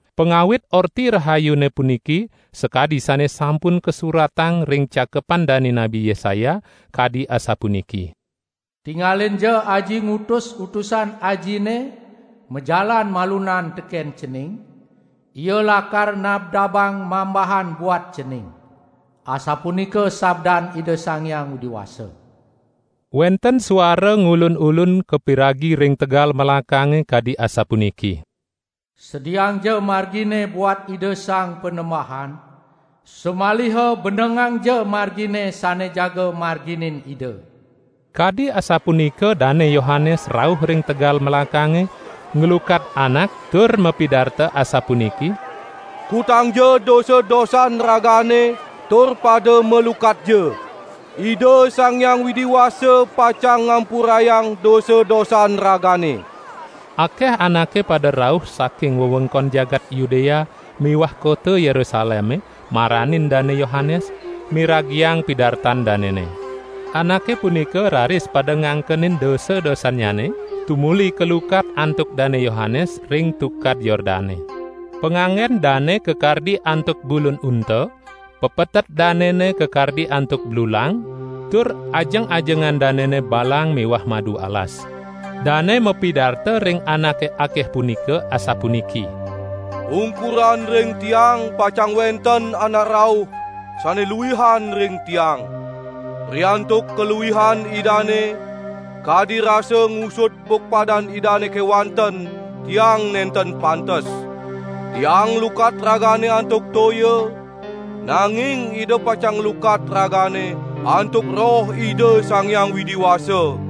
Pangawit Orti Rahayune puniki sakadi sane sampun kasuratang ring Cakepan dane Nabi Yesaya kadi asapuniki: " 'Tingalinja Aji ngutus utusan Ajine majalan malunan teken Cening, ia lakar nabdabang mambahan buat Cening.' Asapunika sabdan Ida Sang Hyang Widi Wasa. Wenten suara ngulun-ulun kapiragi ring tegal melakange kadi asapuniki: 'Sediaangja margine buat Ida Sang Panembahan, samaliha benengangja margine sane jaga marginin Ida!'" Kadi asapunika Dane Yohanes rauh ring tegal melakange, nglukat anak tur mapidarta asapuniki: "Kutangja dosa-dosan ragane tur pada malukatja. Ida Sang Hyang Widi Wasa pacang ngampurayang dosa-dosan ragane." Akeh anake pada rauh saking wewengkon jagat Yudea miwah kota Yerusaleme maranin Dane Yohanes, miragiang pidartan danene. Anake punika raris pada ngangkenin dosa-dosannyane, tumuli kalukat antuk Dane Yohanes ring Tukad Yordane. Panganggen dane kakardi antuk bulun unta, pepetet danene kakardi antuk blulang, tur ajeng-ajengan danene balang miwah madu alas. Dane mapidarta ring anake akeh punika asapuniki: "Ungkuran ring tiang pacang wenten Anak rauh, sane luihan ring tiang. Riantuk kaluihan Idane, kadi rasa ngusud bukpadan Idane kewanten tiang nenten pantes. Tiang nglukat ragane antuk toya, nanging Ida pacang nglukat ragane antuk Roh Ida Sang Hyang Widi Wasa."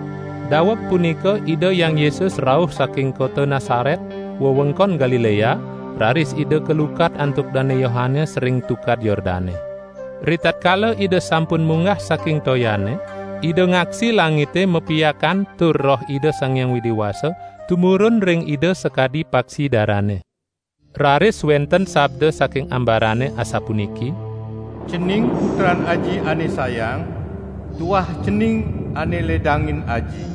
Daweg punika Ida Hyang Yesus rauh saking kota Nasaret, wewengkon Galilea, raris Ida kalukat antuk Dane Yohanes ring Tukad Yordane. Ritatkala Ida sampun munggah saking toyane, Ida ngaksi langite mapiakan tur Roh Ida Sang Hyang Widi Wasa tumurun ring Ida sakadi paksi darane. Raris wenten sabda saking ambarane asapuniki: "Cening Putran Aji ane sayang, tuah Cening ane ledangin Aji."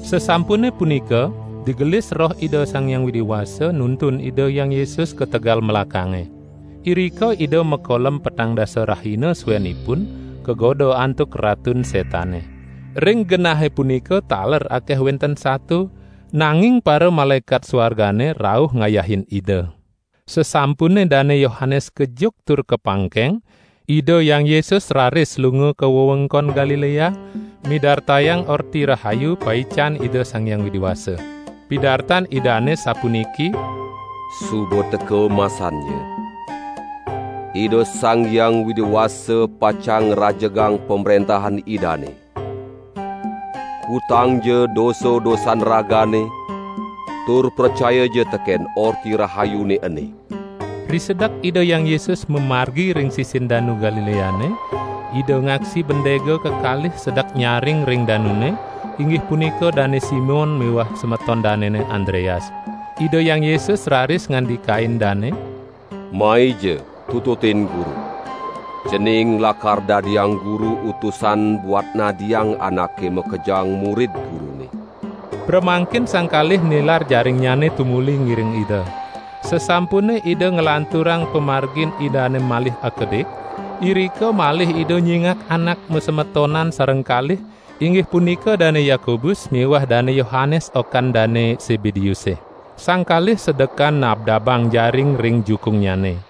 Sasampune punika, digelis Roh Ida Sang Hyang Widi Wasa nuntun Ida Hyang Yesus ka tegal melakange. Irika Ida makolem petang dasa rahina suenipun, kagoda antuk Ratun Setane. Ring genahe punika taler akeh wenten sato, nanging paramalaekat suargane rauh ngayahin Ida. Sasampune Dane Yohanes kejuk tur kapangkeng, Ida Hyang Yesus raris lunga ka wewengkon Galilea midartayang Orti Rahayu paican Ida Sang Hyang Widi Wasa. Pidartan Idane sapuniki: "Suba teka masannya: Ida Sang Hyang Widi Wasa pacang ngrajegang Pamrentahan Idane. Kutangja dosa-dosan ragane tur pracayaja teken Orti Rahayune ene!" Risedek Ida Hyang Yesus mamargi ring sisin Danu Galileane, Ida ngaksi bandega kekalih sedek nyaring ring danune, inggih punika Dane Simon miwah semeton danene Andreas. Ida Hyang Yesus raris ngandikain dane: "Maija tututin Guru. Cening lakar dadiang Guru utusan buat nadiang anake makejang murid Gurune." Pramangkin sang kalih nilar jaringnyane tumuli ngiring Ida. Sasampune Ida nglanturang pamargin Idane malih akedik, irika malih Ida nyingak anak masemetonan sareng kalih, inggih punika Dane Yakobus miwah Dane Yohanes okan Dane Sebedeuse. Sang kalih sedekan nabdabang jaring ring jukungnyane.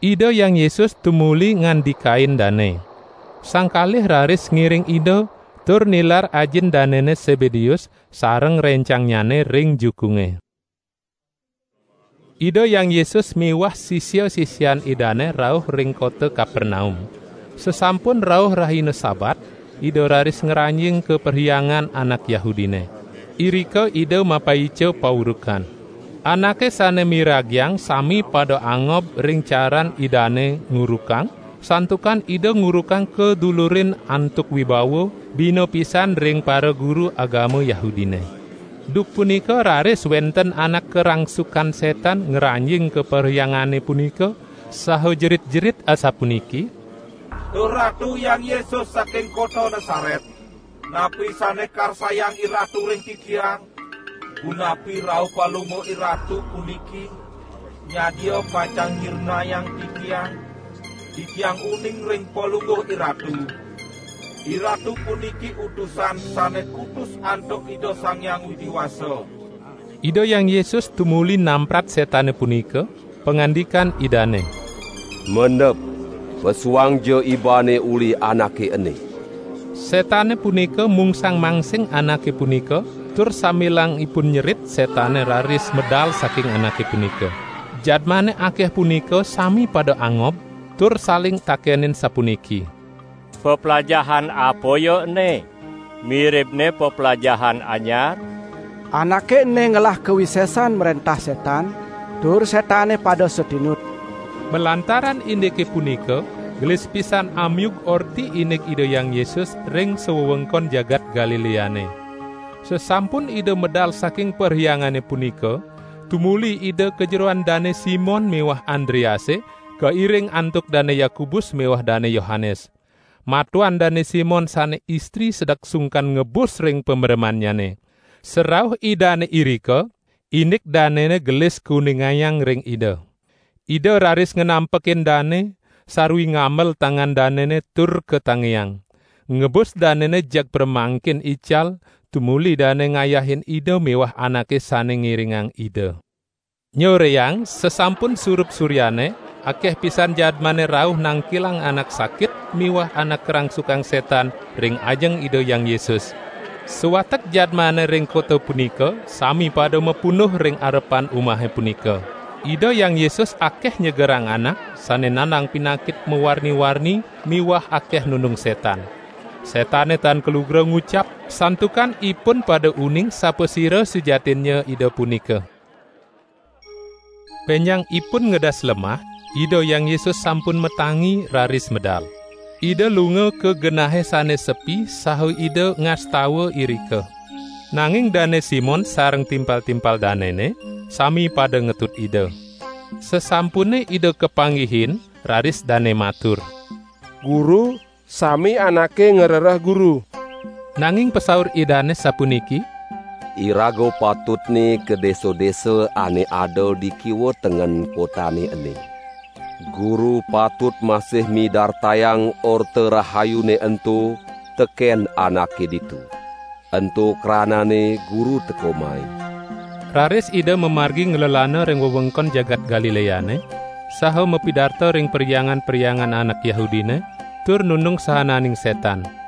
Ida Hyang Yesus tumuli ngandikain dane. Sang kalih raris ngiring Ida, tur nilar ajin danene Sebedeus sareng rencangnyane ring jukunge. Ida Hyang Yesus miwah sisia-sisian Idane rauh ring kota Kapernaum. Sasampun rauh rahina Sabat, Ida raris ngranjing ka perhyangan anak Yahudine. Irika Ida mapaica paurukan. Anake sane miragiang sami pada angob ring caran Idane ngurukang, santukan Ida ngurukang kadulurin antuk wibawa, bina pisan ring paraguru agama Yahudine. Duk punika raris wenten anak karangsukan setan ngranjing ka perhyangane punika, saha jerit-jerit asapuniki: "Duh Ratu Hyang Yesus saking kota Nasaret, napi sane karsayang IRatu ring titiang? Punapi rauh Palungguh IRatu puniki nyadia pacang nyirnayang titiang? Titiang uning ring Palungguh IRatu. IRatu puniki Utusan sane kutus antuk Ida Sang Hyang Widi Wasa." Ida Hyang Yesus tumuli namprat setane punika, pangandikan Idane: "Mendep pesuangja ibane uli anake ene!" Setane punika mungsang-mangsing anake punika, tur sambilang ipun nyerit setane raris medal saking anake punika. Jadmane akeh punika sami pada angob tur saling takenin sapuniki: "Peplajahan apa ya ene! Miribne peplajahan anyar? Anake ene ngelah kawisesan mrentah setan, tur setane pada satinut." Malantaran indike punika, gelis pisan amiug orti indik Ida Hyang Yesus ring sawewengkon jagat Galileane. Sasampun Ida medal saking perhyangane punika, tumuli Ida ka jeroan Dane Simon miwah Andrease, kairing antuk Dane Yakobus miwah Dane Yohanes. Matuan Dane Simon sane istri sedek sungkan ngebus ring pameremannyane. Sarauh Idane irika, indik danene gelis kuningayang ring Ida. Ida raris nganampekin dane, sarwi ngambel tangan danene tur katangiang. Ngebus danene jeg pramangkin ical, tumuli dane ngayahin Ida miwah anake sane ngiringang Ida. Nyoreang, sasampun surup suryane, akeh pisan jadmane rauh nangkilang anak sakit miwah anak karangsukan setan ring ajeng Ida Hyang Yesus. Sawatek jadmane ring kota punika sami pada mapunduh ring arepan umahe punika. Ida Hyang Yesus akeh nyegerang anak sane nandang pinakit mawarni-warni miwah akeh nundung setan. Setane tan kalugra ngucap, santukan ipun pada uning sapasira sujatinnya Ida punika. Benjangipun ngedas lemah, Ida Hyang Yesus sampun matangi, raris medal. Ida lunga ka genahe sane sepi saha Ida ngastawa irika. Nanging Dane Simon sareng timpal-timpal danene sami pada ngetut Ida. Sasampune Ida kapanggihin, raris dane matur: "Guru, sami anake ngrereh Guru." Nanging pasaur Idane, sapuniki: "Iraga patutne ka desa-desa ane ada di kiwa tengen kotane ene. Guru patut masih midartayang Orta Rahayune ento teken anake ditu. Ento kranane Guru teka mai." Raris Ida mamargi nglelana ring wewengkon jagat Galileane, saha mapidarta ring perhyangan-perhyangan anak Yahudine, tur nundung saananing setan.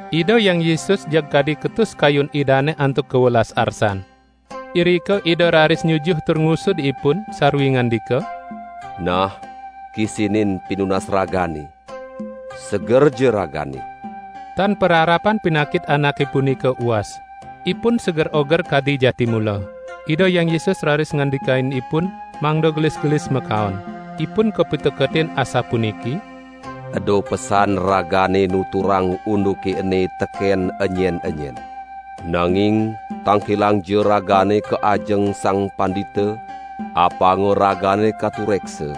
Ida Hyang Yesus jeg kadi ketus kayun Idane antuk kawelas arsan. Irika Ida raris nyujuh tur ngusud ipun, sarwi ngandika: "Nah kisinin pinunas ragane, segerja ragane!" Tan pararapan pinakit anake punika uas. Ipun seger oger kadi jati mula. Ida Hyang Yesus raris ngandikain ipun mangda gelis-gelis makaon. Ipun kapiteketin asapuniki: "Eda pesan ragane nuturang unduke ene teken enyen-enyen. Nanging tangkilangja ragane ka ajeng sang pandita, apanga ragane katureksa,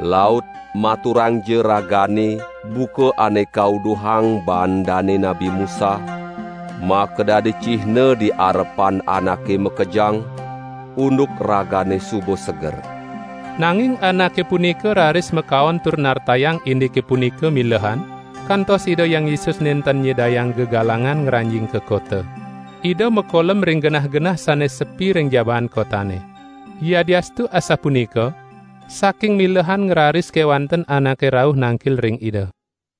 laut maturanja ragane buka ane kauduhang baan dane Nabi Musa, makadadi cihna di arepan anake makejang, unduk ragane suba seger." Nanging anake punika raris makaon tur nartayang indike punika milehan, kantos Ida Hyang Yesus nenten nyidayang gegalangan ngranjing ka kota. Ida makolem ring genah-genah sane sepi ring jabaan kotane. Yadiastu asapunika, saking milehan ngraris kewanten anake rauh nangkil ring Ida.